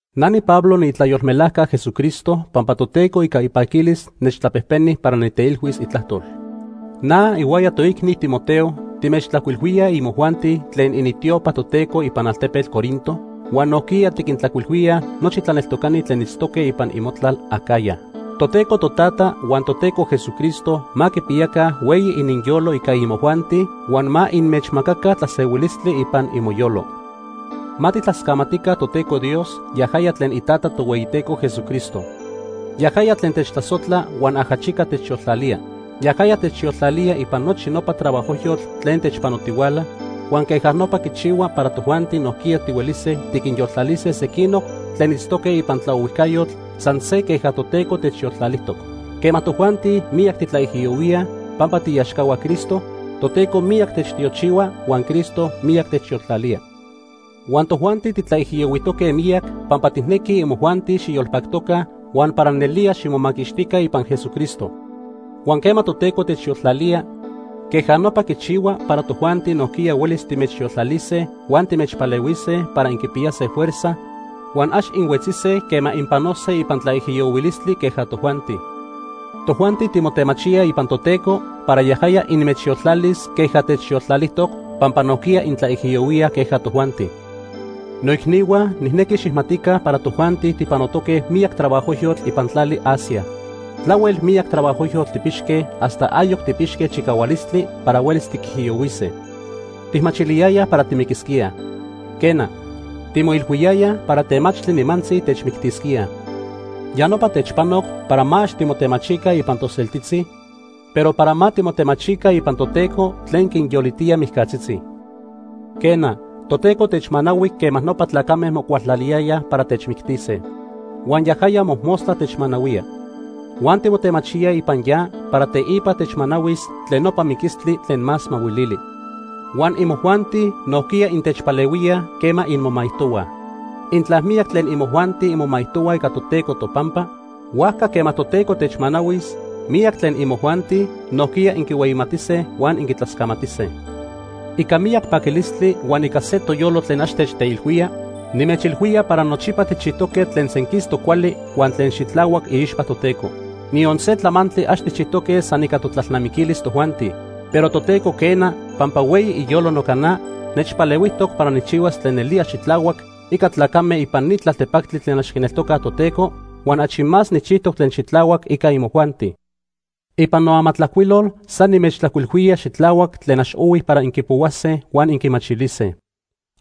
Na niPablo niitlayolmelajca Jesucristo pampa Toteco ica ipaquilis nechtlapejpeni para niteilhuis itlajtol. Na ihuaya toicni Timoteo timechtlajcuilhuíaj imojuanti tlen initiopa Toteco ipan altepetl Corinto huan nojquiya tiquintlajcuilhuíaj nochi tlaneltocani tlen itztoque ipan imotlal Acaya. Toteco Totata huan Toteco Jesucristo ma quipiyaca hueyi ininyolo ica imojuanti huan ma inmechmacaca tlasehuilistli ipan imoyolo. Ma tijtlascamatica Toteco Dios, yajaya tlen iTata Tohueyiteco Jesucristo. Yajaya tlen techtlasojtla huan ajachica techyoltlalía. Yajaya techyoltlalía ipan nochi nopa trabajojyotl tlen techpanotihuala huan queja nopa quichihua para tojuanti nojquiya tihuelise tiquinyoltlalise sequinoc tlen itztoque ipan tlaohuijcayotl san se queja Toteco techyoltlalijtoc. Quema tojuanti miyac titlaijiyohuíaj pampa tiiaxcahua Cristo, Toteco miyac techtiochihua huan Cristo miyac techyoltlalía. Huan tojuanti titlaijiyohuijtoque miyac pampa tijnequij imojuanti xiyolpactoca huan para nelía ximomaquixtica ipan Jesucristo. Huan quema Toteco techyoltlalía, queja nopa quichihua para tojuanti nojquiya huelis timechyoltlalise huan timechpalehuise para inquipiyase fuerza huan ax inhuetzise quema inpanose ipan tlaijiyohuilistli queja tojuanti. Tojuanti timotemachíaj ipan Toteco para yajaya inmechyoltlalis queja techyoltlalijtoc pampa nojquiya intlaijiyohuíaj queja tojuanti. Noicnihua, nijnequi xijmatica para tojuanti tijpanoque miyac trabajojyotl ipan tlali Asia. Tlahuel miyac trabajojyotl tijpixque hasta ayoc tijpixque chicahualistli para huelis tiquijiyohuise. Tijmachiliyayaj para timiquisquíaj. Quena, timoilhuiyayaj para temachtli nimantzi techmictisquíaj. Ya nopa techpanoc para ma ax timotemachica ipan toseltitzi, pero para ma timotemachica ipan Toteco tlen quinyolitía mijcatzitzi. Quena, Toteco techmanahui quema nopa tlacame mocualtlaliyayaj para techmictise. Huan yajaya mojmostla techmanahuía. Huan timotemachíaj ipan ya para teipa techmanahuis tlen nopa miquistli tlen más mahuilili. Huan imojuanti nojquiya intechpalehuíaj quema inmomaijtohuaj. Intla miyac tlen imojuanti inmomaijtohuaj ica Toteco topampa, huajca quema Toteco techmanahuis, miyac tlen imojuanti nojquiya inquihueyimatise huan inquitlascamatise. Ica miyac paquilistli huan ica se toyolo tlen ax techteilhuía, nimechilhuía para nochipa tijchijtoque tlen senquistoc cuali huan tlen xitlahuac iixpa Toteco. Niyon se tlamantli ax tijchijtoque san ica totlalnamiquilis tojuanti. Pero Toteco quena, pampa hueyi iyolo noca na, nechpalehuijtoc para nijchihuas tlen nelía xitlahuac ica tlacame ipan ni tlaltepactli tlen ax quineltocaj Toteco huan achi más nijchijtoc tlen xitlahuac ica imojuanti. Ipan noamatlajcuilol san nimechtlajcuilhuía xitlahuac tlen ax ohui para inquipohuase huan inquimachilise.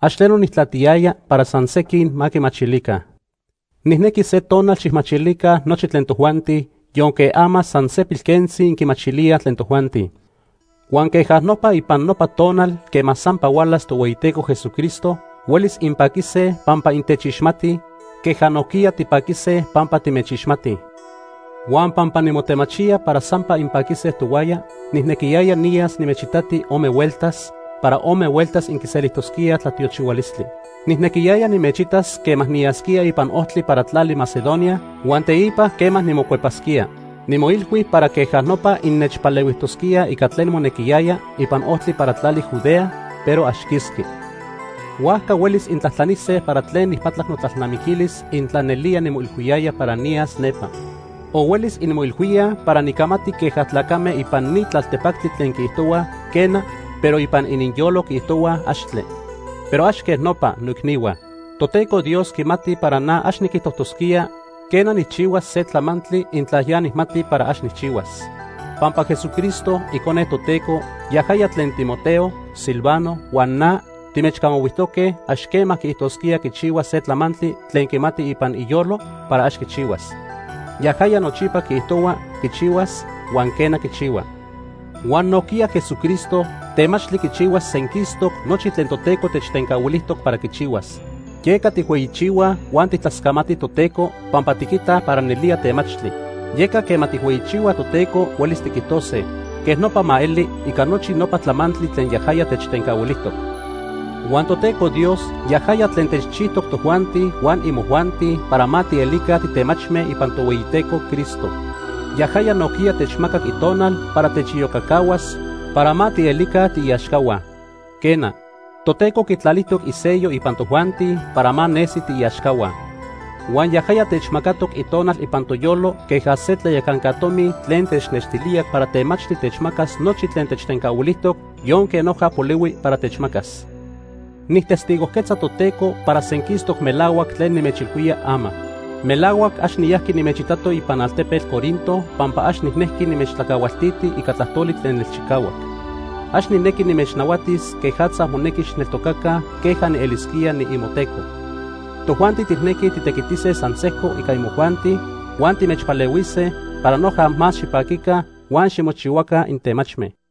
Ax tleno nijtlatiyaya para san sequin ma quimachilica. Nijnequi se tonal xijmachilica nochi tlen tojuanti, yonque ama san se pilquentzi inquimachilíaj tlen tojuanti. Huan queja nopa ipan nopa tonal quema sampa hualas Tohueyiteco Jesucristo, huelis inpaquise pampa intechixmatij, queja nojquiya tipaquise pampa timechixmatij. Huan pampa nimotemachía para sampa inpaquise tohuaya, nijnequiyaya niyas nimechitati ome hueltas, para ome hueltas inquiselijtosquíaj tlatiochihualistli. Nijnequiyaya nimechitas quema niyasquía ipan ojtli para tlali Macedonia huan teipa quema nimocuepasquía. Nimoilhui para queja nopa innechpalehuijtosquíaj ica tlen monequiyaya ipan ojtli para tlali Judea, pero ax quisqui. Huajca huelis intlajtlanise para tlen nijpatlac notlalnamiquilis intla nelía nimoilhuiyaya para niyas nepa. O huelis inmoilhuíaj para nicamati queja tlacame ipan ni tlaltepactli tlen quiijtohuaj, “quena”, pero ipan ininyolo quiijtohuaj, “axtle”. Pero ax quej nopa, noicnihua. Toteco Dios quimati para na ax niquijtojtosquía, quena, nijchihuas se tlamantli, intla ya nijmati para ax nijchihuas. Pampa Jesucristo, Icone Toteco, yajaya tlen Timoteo, Silvano huan na timechcamahuijtoque, ax quema quiijtosquía quichihuas se tlamantli tlen quimati ipan iyolo para ax quichihuas. Yajaya nochipa quiijtohua quichihuas huan, quena, quichihua. Huan nojquiya Jesucristo temachtli quichihuas senquistoc nochi tlen Toteco techtencahuilijtoc para quichihuas. Yeca tijhueyichihuaj huan tijtlascamatij Toteco pampa tiquitaj para nelía temachtli. Yeca quema tijhueyichihuaj Toteco huelis tiquijtose: “Quej nopa ma eli” ica nochi nopa tlamantli tlen yajaya techtencahuilijtoc. Huan Toteco Dios yajaya tlen techchijtoc tojuanti huan imojuanti para ma tielica titemachme ipan Tohueyiteco Cristo. Yajaya nojquiya techmacac Itonal para techiyocacahuas para ma tielica tiiaxcahua. Quena, Toteco quitlalijtoc isello ipan tojuanti para ma nesi tiiaxcahua. Huan yajaya techmacatoc Itonal ipan toyolo queja se tlayacanca tomi tlen technextilía para temachtli techmacas nochi tlen techtencahuilijtoc yonque noja polihui para techmacas. Nijtestigojquetza Toteco para senquistoc melahuac tlen nimechilhuía ama. Melahuac ax niyajqui nimechitato ipan altepetl Corinto pampa ax nijnejqui nimechtlacahualtiti ica tlajtoli tlen nelchicahuac. Ax nijnequi nimechnahuatis quejatza monequi xijneltocaca queja nielisquía niimoteco. Tojuanti tijnequij titequitise san sejco ica imojuanti huan timechpalehuise para noja más xipaquica huan ximochihuaca intemachme.